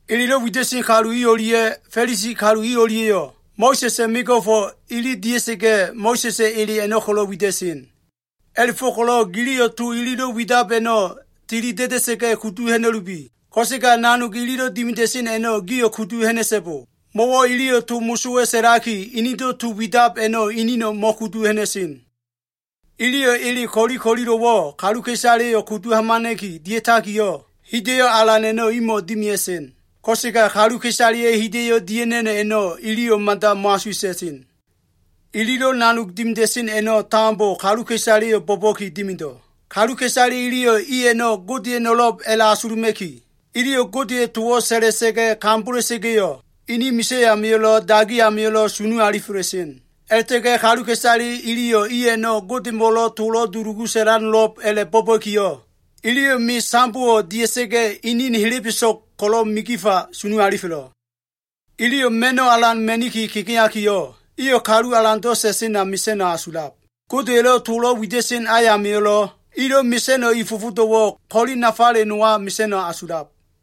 “Elelo꞉ wida꞉sen kalu i o꞉lia꞉ Fa꞉lisi kalu i o꞉lia꞉yo꞉ Mo꞉sa꞉sa꞉ mego꞉fo꞉ ili dia꞉sa꞉ga꞉, Mo꞉sa꞉sa꞉ ele a꞉no꞉ ko꞉lo꞉ wida꞉sen. A꞉la꞉fo꞉ko꞉lo꞉ giliyo꞉ to ililo꞉ widab a꞉no꞉ tili da꞉da꞉sa꞉ga꞉ kudu ha꞉na꞉lubi. Ko꞉sega nanog ililo꞉ dimida꞉sen a꞉no꞉ gio꞉ kudu ha꞉na꞉so꞉bo. Mo꞉wo꞉ iliyo꞉ to mosowa꞉ sa꞉laki, inido꞉ to widab a꞉no꞉ inino꞉ mo꞉kudu ha꞉na꞉sen. Iliyo꞉ ele ko꞉li ko꞉lilo꞉wo꞉ kaluka꞉isaleyo꞉ kudu hamana꞉ki dia꞉takiyo꞉, hida꞉yo꞉ alan a꞉no꞉ imo꞉ dimia꞉sen. Ko꞉sega kaluka꞉isaleya꞉ hida꞉yo꞉ dia꞉ha꞉na꞉no꞉ a꞉no꞉, iliyo꞉ mada mo꞉asuwa꞉ta꞉sen. Ililo꞉ nanog dimida꞉sen a꞉no꞉ tambo, kaluka꞉isaleyo꞉ bo꞉ba꞉ki dimido꞉. Kaluka꞉isale iliyo꞉ i a꞉no꞉ Godeya꞉no꞉lo꞉b a꞉la꞉asuluma꞉ki, iliyo꞉ Godeya꞉ towo꞉ sa꞉sa꞉la꞉sa꞉ga꞉ kambola꞉sa꞉ga꞉yo꞉, ini misa꞉ amio꞉lo꞉, dagi amio꞉lo꞉ sunu alifela꞉sen. A꞉la꞉ta꞉ga꞉ kaluka꞉isale iliyo꞉ i a꞉no꞉ Godemo꞉lo꞉ tolo꞉ dulugu sa꞉lano꞉lo꞉b a꞉la꞉ bo꞉ba꞉kiyo꞉, iliyo꞉ me sambowo꞉ dia꞉sa꞉ga꞉ inin helebeso꞉g ko꞉lo꞉ migifa sunu alifelo꞉. Iliyo꞉ ma꞉no꞉ alan ma꞉niki kegeakiyo꞉, iyo꞉ kalu alando꞉ sa꞉sena mesa꞉no꞉ asulab. Godeya꞉lo꞉ tolo꞉ wida꞉sen ayamio꞉lo꞉, ilo꞉ mesa꞉no꞉ i fofodo꞉wo꞉ ko꞉li nafale nowa mesa꞉no꞉ asulab.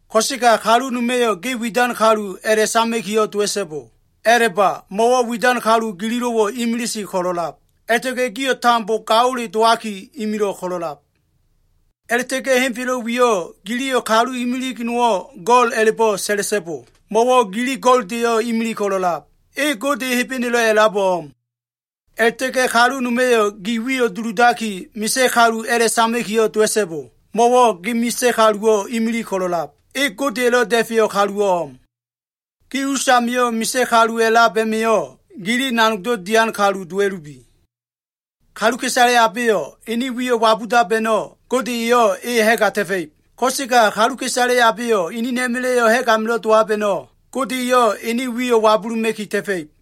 “Ko꞉sega kalu noma꞉yo꞉ ge ‘widan kalu’ a꞉la꞉sama꞉kiyo꞉ dowa꞉so꞉bo. A꞉la꞉ba, mo꞉wo꞉ widan kalu gililo꞉wo꞉ imilise ko꞉lo꞉lab, a꞉la꞉ta꞉ga꞉ gio꞉ tambo gaole dowaki, imilo꞉ ko꞉lo꞉lab. A꞉la꞉ta꞉ga꞉ henfelo꞉ wiyo꞉ giliyo꞉ kalu imilig nowo꞉ go꞉l a꞉la꞉bo꞉ sa꞉la꞉so꞉bo. Mo꞉wo꞉ gili go꞉ldeyo꞉ imilig ko꞉lo꞉lab. E Gode Hebenelo꞉ a꞉labo꞉ o꞉m. A꞉la꞉ta꞉ga꞉ kalu noma꞉yo꞉ ge wiyo꞉ duludaki, misa꞉ kalu a꞉la꞉sama꞉kiyo꞉ dowa꞉so꞉bo. Mo꞉wo꞉ ge misa꞉ kaluwo꞉ imilig ko꞉lo꞉lab. E Godeya꞉lo꞉ Da꞉feyo꞉ kaluwo꞉ o꞉m. Gi usamio꞉ misa꞉ kalu a꞉lab a꞉ma꞉yo꞉ gili nanogdo꞉ dian kalu dowa꞉lubi. Kaluka꞉isale abeyo꞉ enen wiyo꞉ wabudab a꞉no꞉, Gode eyo꞉ e ha꞉ga ta꞉fa꞉ib. Ko꞉sega kaluka꞉isale abeyo꞉ enena꞉ma꞉la꞉yo꞉ ha꞉g amilo꞉ dowab a꞉no꞉, Gode eyo꞉ ene wiyo꞉ wabuluma꞉ki ta꞉fa꞉ib.”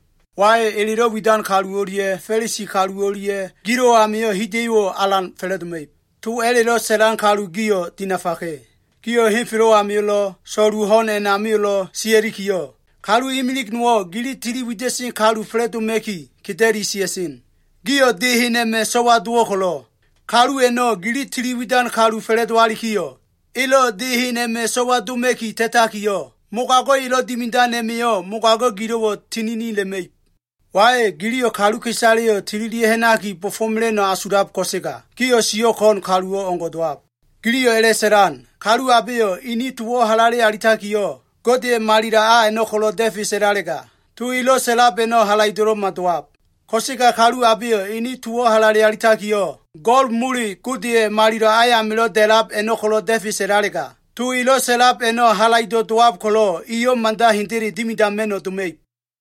“Wai, elelo꞉ widan kalu o꞉lia꞉ Fa꞉lisi kalu o꞉lia꞉ gilo꞉ amio꞉ hida꞉yo꞉wo꞉ alan fa꞉la꞉doma꞉ib. To mosowa꞉lo꞉ widan kalu gio꞉ dinafaka꞉. Gio꞉ henfelo꞉ amio꞉lo꞉, so꞉lu ho꞉n a꞉namio꞉lo꞉ sia꞉likiyo꞉, kalu imilig nowo꞉ gili tili wida꞉sen kalu fa꞉la꞉doma꞉ki, keda꞉li sia꞉sen. Gio꞉ de hen a꞉ma꞉ so꞉wa dowo꞉ ko꞉lo꞉, kalu a꞉no꞉ gili tili widan kalu fa꞉la꞉dowalikiyo꞉, elo꞉ de hen a꞉ma꞉ so꞉wa doma꞉ki ta꞉takiyo꞉, mogago꞉ elo꞉ dimidan a꞉ma꞉yo꞉ mogago꞉ gilo꞉wo꞉ tiginila꞉ma꞉ib. “Wai, giliyo꞉ kaluka꞉isaleyo꞉ tililia꞉ ha꞉naki bo꞉fo꞉mela꞉no꞉ asulab ko꞉sega, gio꞉ siyo꞉ ko꞉n kalu o꞉ngo꞉ dowab. Giliyo꞉ a꞉la꞉sa꞉lan, ‘Kalu abeyo꞉ ene towo꞉ halale alitakiyo꞉, Godeya꞉ malilo꞉ a a꞉no꞉ ko꞉lo꞉ da꞉fe sa꞉lalega, to elo꞉ sa꞉lab a꞉no꞉ halaido꞉lo꞉ma dowab. Ko꞉sega kalu abeyo꞉ ene towo꞉ halale alitakiyo꞉, go꞉l mole, Godeya꞉ malilo꞉ a amilo꞉ da꞉lab a꞉no꞉ ko꞉lo꞉ da꞉fe sa꞉lalega, to elo꞉ sa꞉lab a꞉no꞉ halaido꞉ dowab ko꞉lo꞉ eyo꞉ mada hendele dimidama꞉no꞉ doma꞉ib.’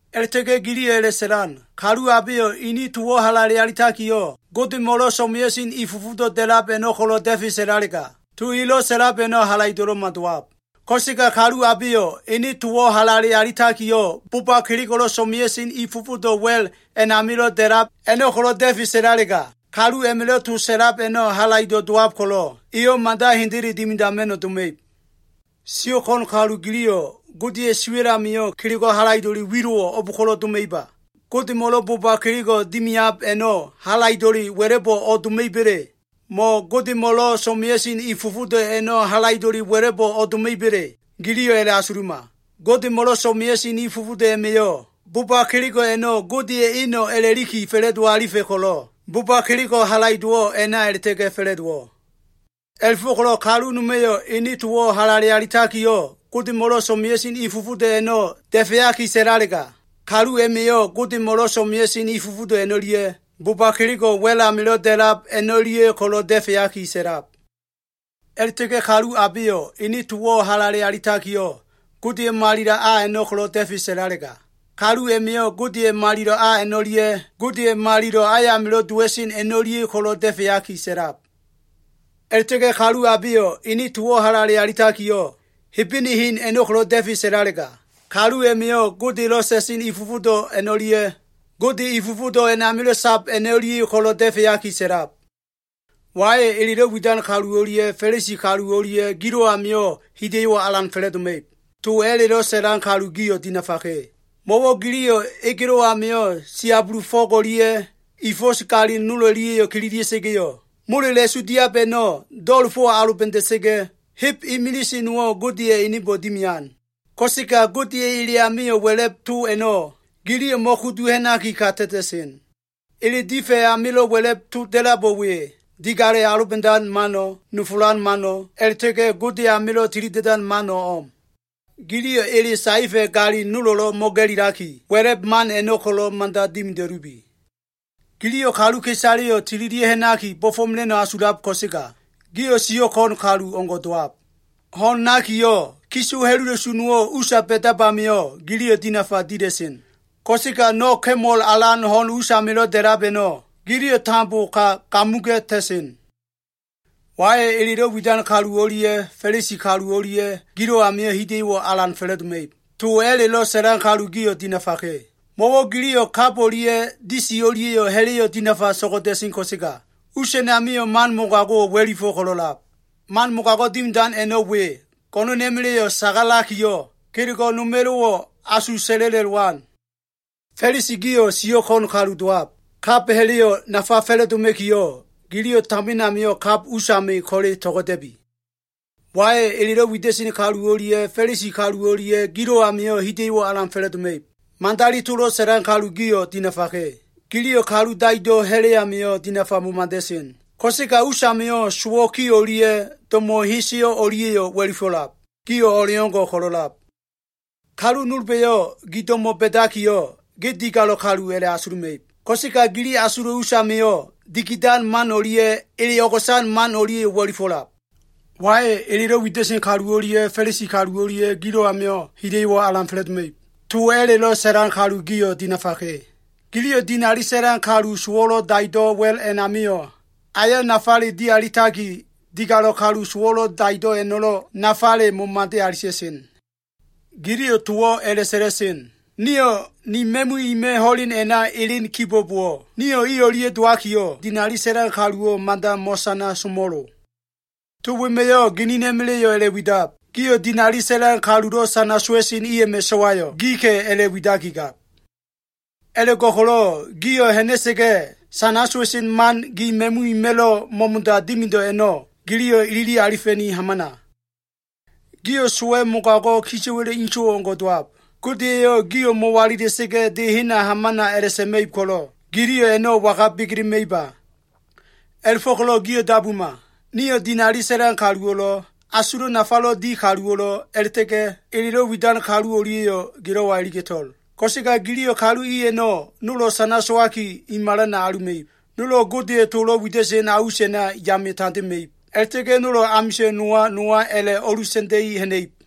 A꞉la꞉ta꞉ga꞉ giliyo꞉ a꞉la꞉sa꞉lan, ‘Kalu abeyo꞉ ene towo꞉ halale alitakiyo꞉, Godemo꞉lo꞉ so꞉mea꞉sen i fofodo꞉ da꞉lab a꞉no꞉ ko꞉lo꞉ da꞉fe sa꞉lalega, to elo꞉ sa꞉lab a꞉no꞉ halaido꞉lo꞉ma dowab. Ko꞉sega kalu abeyo꞉ ene towo꞉ halale alitakiyo꞉, boba kelego꞉ so꞉mea꞉sen i fofodo꞉ wa꞉l a꞉namilo꞉ da꞉lab a꞉no꞉ ko꞉lo꞉ da꞉fe sa꞉lalega, kalu a꞉ma꞉lo꞉ to sa꞉lab a꞉no꞉ halaido꞉ dowab ko꞉lo꞉, eyo꞉ mada hendele dimidama꞉no꞉ doma꞉ib.’ Sio꞉ ko꞉n kalu giliyo꞉, Godeya꞉ siwa꞉l amio꞉ kelego꞉ halaido꞉le wilo꞉wo꞉ o꞉b ko꞉lo꞉ doma꞉iba? Godemo꞉lo꞉ boba kelego꞉ dimiab a꞉no꞉ halaido꞉le wa꞉la꞉bo꞉ o꞉doma꞉iba꞉le? Mo꞉ Godemo꞉lo꞉ so꞉mea꞉sen i fofodo꞉ a꞉no꞉ halaido꞉le wa꞉la꞉bo꞉ doma꞉iba꞉le? Giliyo꞉ a꞉la꞉asuluma. Godemo꞉lo꞉ so꞉mea꞉sen i fofodo꞉ a꞉ma꞉yo꞉, boba kelego꞉ a꞉no꞉ Godeya꞉ eno꞉ a꞉la꞉liki fa꞉la꞉do alifa꞉ ko꞉lo꞉, bo꞉ba kelego꞉ halaido꞉wo꞉ a꞉na a꞉la꞉ta꞉ga꞉ fa꞉la꞉dowo꞉. A꞉la꞉fo꞉ko꞉lo꞉ kalu noma꞉yo꞉ ene towo꞉ halale alitakiyo꞉, Godemo꞉lo꞉ so꞉mea꞉sen i fofodo꞉ a꞉no꞉ da꞉feaki sa꞉lalega, kalu a꞉ma꞉yo꞉ Godemo꞉lo꞉ so꞉mea꞉sen i fofodo꞉ a꞉no꞉lia꞉, boba kelego꞉ wa꞉l amilo꞉ da꞉lab a꞉no꞉lia꞉ ko꞉lo꞉ da꞉feaki sa꞉lab. A꞉la꞉ta꞉ga꞉ kalu abeyo꞉ ene towo꞉ halale alitakiyo꞉, Godeya꞉ malilo꞉ a a꞉no꞉ da꞉fe sa꞉lalega, kalu a꞉ma꞉yo꞉ Godeya꞉ malilo꞉ a a꞉no꞉lia꞉, Gode malilo꞉ ayamilo꞉ dowa꞉sen a꞉no꞉lia꞉ ko꞉lo꞉ da꞉feaki sa꞉lab. A꞉la꞉ta꞉ga꞉ kalu abeyo꞉ ene towo꞉ halale alitakiyo꞉, Hebene hen a꞉no꞉ ko꞉lo꞉ da꞉fe sa꞉lalega, kalu a꞉ma꞉yo꞉ Godelo꞉ sa꞉sen i fofodo꞉ a꞉no꞉lia꞉, Gode i fofodo꞉ a꞉namilo꞉ sab a꞉no꞉lia꞉yo꞉ ko꞉lo꞉ da꞉feaki sa꞉lab. “Wai, elelo꞉ widan kalu o꞉lia꞉ Fa꞉lisi kalu o꞉lia꞉ gilo꞉ amio꞉ hida꞉yo꞉wo꞉ alan fa꞉la꞉doma꞉ib. To mosowa꞉lo꞉ widan kalu gio꞉ dinafaka꞉. Mo꞉wo꞉ giliyo꞉ egelo꞉ amio꞉ siabulu fo꞉g o꞉lia꞉ i fo꞉s galin nol o꞉lia꞉yo꞉ kililia꞉sa꞉ga꞉yo꞉, molela꞉su diab a꞉no꞉ do꞉la꞉fo꞉ aloba꞉da꞉sa꞉ga꞉, heb imilise nowo꞉ Godeya꞉ enebo꞉ dimian. Ko꞉sega Godeya꞉ ele amio꞉ wa꞉la꞉b to a꞉no꞉ giliyo꞉ mo꞉kudu ha꞉naki, ka ta꞉ta꞉sen. Ele difa꞉ amilo꞉ wa꞉la꞉b to da꞉labo꞉ we, digalo꞉ aloba꞉dan mano꞉, nofolan mano꞉, a꞉la꞉ta꞉ga꞉ Gode amilo꞉ tilida꞉dan mano꞉ o꞉m. Giliyo꞉ ele saefa꞉ galin nolo꞉lo꞉ mo꞉ga꞉lilaki, wa꞉la꞉b man a꞉no꞉ ko꞉lo꞉ mada dimida꞉lubi. Giliyo꞉ kaluka꞉isaleyo꞉ tililia꞉ ha꞉naki bo꞉fo꞉mela꞉no꞉ asulab ko꞉sega, gio꞉ siyo꞉ ko꞉n kalu o꞉ngo꞉ dowab. Ho꞉n nakiyo꞉, kiso ha꞉lula꞉su nowo꞉ usa ba꞉dab amio꞉, giliyo꞉ dinafa dila꞉sen. Ko꞉sega no꞉ ka꞉mol alan ho꞉n us amilo꞉ da꞉lab a꞉no꞉, giliyo꞉ tambo ka gamuga꞉ta꞉sen. “Wai, elelo꞉ widan kalu o꞉lia꞉ Fa꞉lisi kalu o꞉lia꞉ gilo꞉ amio꞉ hida꞉yo꞉wo꞉ alan fa꞉la꞉doma꞉ib. To mosowa꞉lo꞉ widan kalu gio꞉ dinafaka꞉. Mo꞉wo꞉ giliyo꞉ kab o꞉lia꞉ disi o꞉lia꞉yo꞉ ha꞉la꞉yo꞉ dinafa to꞉go꞉da꞉sen ko꞉sega, us a꞉namio꞉ man mogago꞉wo꞉ wa꞉lifo꞉ ko꞉lo꞉lab. Man mogago꞉ dimidan a꞉no꞉ we, go꞉no꞉na꞉ma꞉la꞉yo꞉ sagalakiyo꞉, kelego꞉ noma꞉lo꞉wo꞉ asu sa꞉la꞉la꞉lowan. Fa꞉lisi gio꞉ sio꞉ ko꞉n kalu dowab. Kab ha꞉la꞉yo꞉ nafa fa꞉la꞉doma꞉kiyo꞉, giliyo꞉ tamin amio꞉ kab usami ko꞉le to꞉go꞉da꞉bi. “Wai, elelo꞉ widan kalu o꞉lia꞉ Fa꞉lisi kalu o꞉lia꞉ gilo꞉ amio꞉ hida꞉yo꞉wo꞉ alan fa꞉la꞉doma꞉ib. Madali tolo꞉ sa꞉lan kalu gio꞉ dinafaka꞉. Giliyo꞉ kalu daido꞉ ha꞉la꞉ amio꞉ dinafa momada꞉sen, ko꞉sega usamio꞉ sowo꞉ ki o꞉lia꞉ do꞉mo꞉ heseyo꞉ o꞉lia꞉yo꞉ wa꞉lifo꞉lab. Gio꞉ o꞉leo꞉ngo꞉ ko꞉lo꞉lab. Kalu nolba꞉yo꞉ gi do꞉mo꞉ ba꞉dakiyo꞉, ge digalo꞉ kalu a꞉la꞉asuluma꞉ib. Ko꞉sega gili asulo꞉ usamio꞉ dikidan man o꞉lia꞉ ele o꞉go꞉san man o꞉lia꞉yo꞉ wa꞉lifo꞉lab. “Wai, elelo꞉ widan kalu o꞉lia꞉ Fa꞉lisi kalu o꞉lia꞉ gilo꞉ amio꞉ hida꞉yo꞉wo꞉ alan fa꞉la꞉doma꞉ib. To mosowa꞉lo꞉ widan kalu gio꞉ dinafaka꞉. Giliyo꞉ dinali sa꞉lan kalu sowo꞉lo꞉ daido꞉ wa꞉l a꞉namio꞉ ayo꞉ nafale dialitaki, digalo꞉ kalu sowo꞉lo꞉ daido꞉ a꞉no꞉lo꞉ nafale momade alita꞉sen. Giliyo꞉ towo꞉ a꞉la꞉sa꞉la꞉sen, ‘Nio꞉ ni ma꞉mu ima꞉ ho꞉len a꞉na elen kibo꞉bowo꞉, nio꞉ i o꞉lia꞉ dowakiyo꞉, dinali sa꞉lan kaluwo꞉ mada mo꞉sana somo꞉lo.’ To wema꞉yo꞉ ginina꞉ma꞉la꞉yo꞉ a꞉la꞉widab. Gio꞉ dinali sa꞉lan kalulo꞉ sana sowa꞉sen i a꞉ma꞉ so꞉wayo꞉ gika꞉ a꞉la꞉widakigab. A꞉la꞉go꞉ko꞉lo꞉ gio꞉ ha꞉na꞉sa꞉ga꞉, sana sowa꞉sen man gi ma꞉mu ima꞉lo꞉ mo꞉mo꞉da dimido꞉ a꞉no꞉, giliyo꞉ ilili alifa꞉niki hamana. “Gio꞉ sowa꞉ mogago꞉, kisa꞉wa꞉la꞉ inso꞉ o꞉ngo꞉ dowab. Gode eyo꞉ gio꞉ mo꞉walila꞉sa꞉ga꞉, de hena hamana a꞉la꞉sa꞉ma꞉ib ko꞉lo꞉, giliyo꞉ a꞉no꞉ waga begelema꞉iba? A꞉la꞉fo꞉ko꞉lo꞉ gio꞉ dabuma! Niyo꞉ dinali sa꞉lan kaluwo꞉lo꞉, asulo꞉ nafalo꞉ di kaluwo꞉lo꞉, a꞉la꞉ta꞉ga꞉ elelo꞉ widan kalu o꞉lia꞉yo꞉ gilo꞉wa iliga꞉to꞉l. Ko꞉sega giliyo꞉ kalu i a꞉no꞉ nolo꞉ sana sowaki, i malana aluma꞉ib. Nolo꞉ Godeya꞉ tolo꞉ wida꞉sen a us a꞉na yame tandema꞉ib. A꞉la꞉ta꞉ga꞉ nolo꞉ amisa꞉n nowa nowa a꞉la꞉ o꞉lusa꞉nda꞉i ha꞉na꞉ib.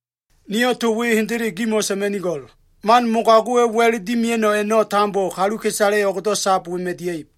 Niyo꞉ to we hendele gimo꞉ sa꞉ma꞉nigo꞉l. Man mogago꞉wa꞉ wa꞉l dimea꞉no꞉ a꞉no꞉ tambo, kaluka꞉isale o꞉gdo꞉ sab wema꞉ dia꞉ib.”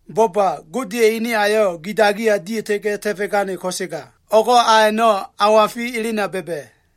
Bo꞉ba! Godeya꞉ ene ayo꞉ gi dagiya dia꞉ta꞉ga꞉ ta꞉fo꞉gane, ko꞉sega o꞉go꞉ a a꞉no꞉ awafi elena ba꞉ba꞉.